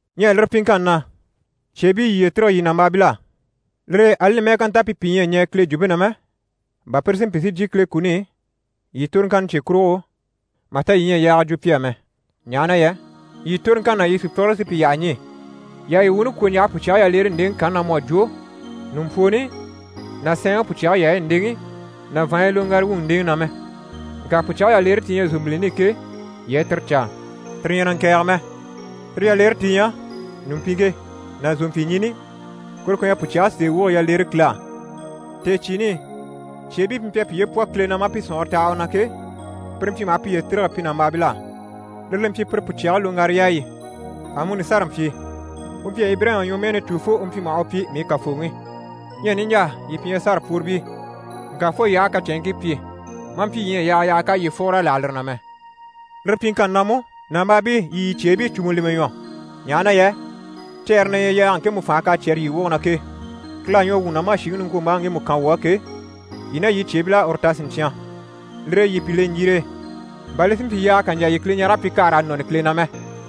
Ɲyɛ lire pyiŋkanni na, cyeebii, yii yiye tîrige yii nàmbaabil'á. Lire e ali li mɛ́ɛ ká nta pi pìi ɲyɛ a ɲɛɛ Kile jwumpe na mɛ, bà pire si mpyi si jyè Kile kuni i yii toroŋkanni cye kurugo, mà ta yii ɲyɛ a yaaga jwo pi á mɛ, ɲaha na yɛ yii toroŋkanni ná yii sùpyigire sí pi yyaha ɲî. Yii àha yii wuuni kwɔ̀ ɲjaha pùcyage yaleere ndeŋi kanni na, mu à jwo ɲùmpwooni ná sɛɛnŋi pùcyage yaayi ndeŋi ná vàanɲyi loŋgara wuyi ndeŋi na mɛ. Ŋka pùcyage yaleere ti ɲyɛ zòmbilini i ke, yii a tire caa. Tire ɲyɛ na ŋkɛ̀ɛge mɛ, tire yaleere ti ɲyɛ ɲùmpiŋke ná zòmpyiɲini, kuru ku ɲyɛ pùcyage sèe woge yaleere Kile á. Tèecyiini i, cyeebii pi mpyi a piye pwɔ Kile na, maa pi sɔ̀nŋɔre taha u na ke, pire mpyi maha piye tîrige pi nàmbaabil'á, lire li mpyi pire pùcyage loŋgara yaayi. Amuni Sara mpyi. U mpyi a Ibirayima ɲwɔmɛɛni cû fo u mpyi maha u pyi: «mii kàfooŋi». Ɲyɛ niɲjaa, yii pi ɲyɛ Sara pworibii, ŋka fo yii aha a kacɛnŋkii pyi, maa mpyi yii ɲyɛ a yaaga yaha k'à yii fùgur'a láha lire na mɛ. Lire pyiŋkanni na mú, nàmbaabii, yii yii cyeebii cùmu lemɛ ɲwɔ, ɲaha na yɛ cɛɛre na ɲyɛ yaaga ŋkemu fànhe k'à cyɛ́rɛ yii woge na ke. Kile à ɲwɔ wuu na maa shìŋi niŋkwombaaŋi ŋgemu kan wuu á ke, yii ná yii cyeebil'à uru ta siɲcyan. Lire e yii pi le ɲjire e, bà li si mpyi yaaga kà ɲjà yii Kileɲarege pyi kà raa nɔni Kile na mɛ.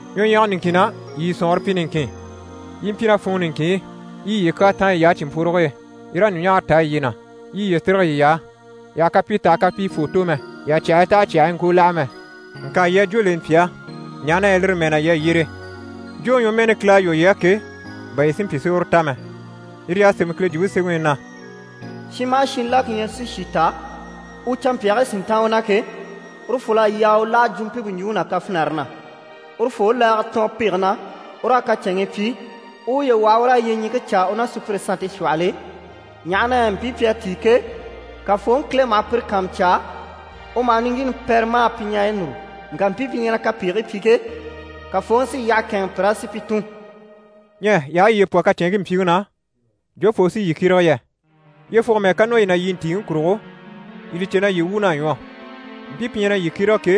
Ɲwɔɲyɛga niŋkin na, yii yii sɔ̀nŋɔre pyi niŋkin, yii i mpyi ná funŋɔ niŋkin i, yii i yiye kyaa táan yiy'á cìnmpworoge e, yii raa ɲùɲaara taa yiye na, yii i yiye tîrige yiy'á. Yii àha kapii tɛ̀gɛ kapii fwoo tò mɛ, yii àha cyàhii tɛ̀gɛ cyàhii ŋkoo láha mɛ. Ŋka yii a jwó leni pi á, ɲaha na yɛ lire mɛɛ na yii à yyere, jwóŋi ɲwɔmɛɛni Kile à lwɔ́ yii á ke, bà yii si mpyi si uru ta mɛ. Yire y'à sémɛ Kile Jwumpe Semɛŋi i na: «Shin maha shin la ku ɲyɛ si shì ta, u canmpyaagii si ntáan u na ke, urufol'à yaa u láha jwumpimpe ɲjwuŋi ná kafinare na. Urufoo u laaga tɔɔn pege na, u raa kacɛnŋii pyi, u u uye waha u raa yyeɲiŋke caa u ná sùpyire sannte shwɔhɔl'e, ɲaha na yɛ mpii pi à tíi ke, Kafooŋi Kile maha pire kàanmucaa, u maha niŋgyiini pɛrɛ maa pi ɲareyi núru. Ŋka mpii pi ɲyɛ na kapegigii pyi ke, Kafooŋi sí yyaha kɛ̂ɛnŋɛ pir'á si pi tùn.» Ɲyɛ yii aha yiye pwɔ kacɛnŋkii mpyiŋi na, jofoo u sí yii kyérege yɛ? Yyefugo mɛ́ɛ ká nɔ yii na yii ntìiŋi kurugo, yii li cè na yii wuun'à ɲwɔ. Mpii pi ɲyɛ na yii kyérege ke,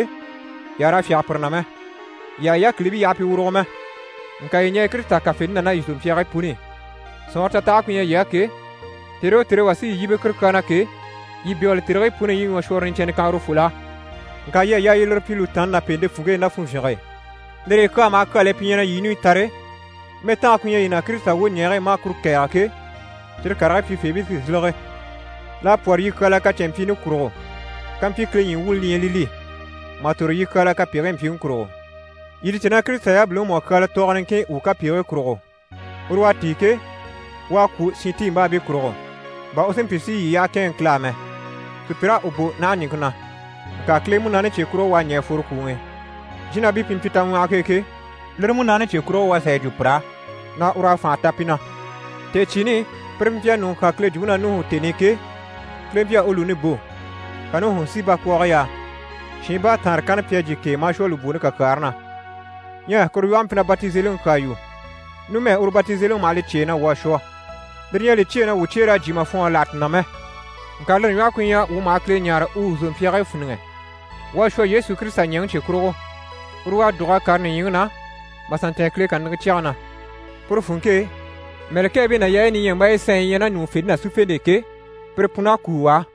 yii àha raa fyáge pire na mɛ, yii àha yii yákilibii yaha pi wùrugo mɛ. Ŋka yii ɲɛɛ Kirisita kafente na ná yii zòmpyaagii puni i. Sɔ̀nŋɔre tatahage ku ɲyɛ yii á ke, tère o tère e wà sí yii yíbe kuru kyaa na ke, yii bégele tèrigii puni i yii i ɲwɔshwɔrɔ niɲcɛnnɛ kan urufol'á. Ŋka yii à yaa yii lire pyi lùtaanni ná pèente funŋke e, ná funvyinge e. Lire e kyaa maha kyal'e pi ɲyɛ na yii ɲùɲyi tare, mɛtange ku ɲyɛ yii na Kirisita wwoɲɛɛge e, maa kuru kɛ̀ɛge ke, cyire karigii pyifeebii sí n‑sílege. L'à pwɔ́rɔ yii kyaala kacɛnmpyiini kurugo, kampyi Kile ɲyii wuuni li ɲyɛ li li, mà tòro yii kyaala kapegigii mpyiŋi kurugo. Yii li cè na Kirisita yabiliŋi mú à kyaala tɔɔgɔ niŋkin wuu kapegigii kurugo. Uru u à tíi ke, u à kwû shintiimbaabii kurugo, bà u si mpyi si yii yyaha kɛ̂ɛnŋɛ Kile á mɛ. Sùpyir'à u bò naha ɲìŋke na, ŋka Kile Munaani cye kurugo u à ɲɛ̀ a fworo kwùŋi i. Jínabii pi mpyi taŋwɔhɔge e ke, lire Munaani cye kurugo mú u à sà yi jwo pir'á na ur'à fànha ta pi na. Tèecyiini i, pire pi mpyi a ɲùŋɔ kyán Kile jwumpe na Nuhu tèni i ke, Kile mpyi a u lùuni bò, ka Nuhu si bakwɔɔge yaa. Shiin baataanre kanna pi à jyè k'e, maa shwɔ lùbwooni kakyaare na. Ɲyɛ kuru lwɔhe mpyi na batizeliŋi kyaa yu. Numɛ uru batizeliŋi maha li cyêe na wuu à shwɔ. Lire ɲyɛ a li cyêe na wuu cyeer'à jyè mà fwɔɔnre láha ti na mɛ, ŋka lire ɲwɔhe ku ɲyɛ wuu maha Kile ɲáare u wuu zòmpyaagii fíniŋɛ. Wuu à shwɔ Yesu Kirisita ɲɛ̀ŋi cye kurugo, uru u à dùg'a kàre nìɲyiŋi na, maa sà ntɛ̀ɛn Kile kàniŋɛ cyɛge na. Puru funŋke e, mɛ̀lɛkɛɛbii ná yaayi niɲyambaayi sanɲyi yi ɲyɛ ná ɲùŋufente ná sífente e ke, pire pun'à kúu u á.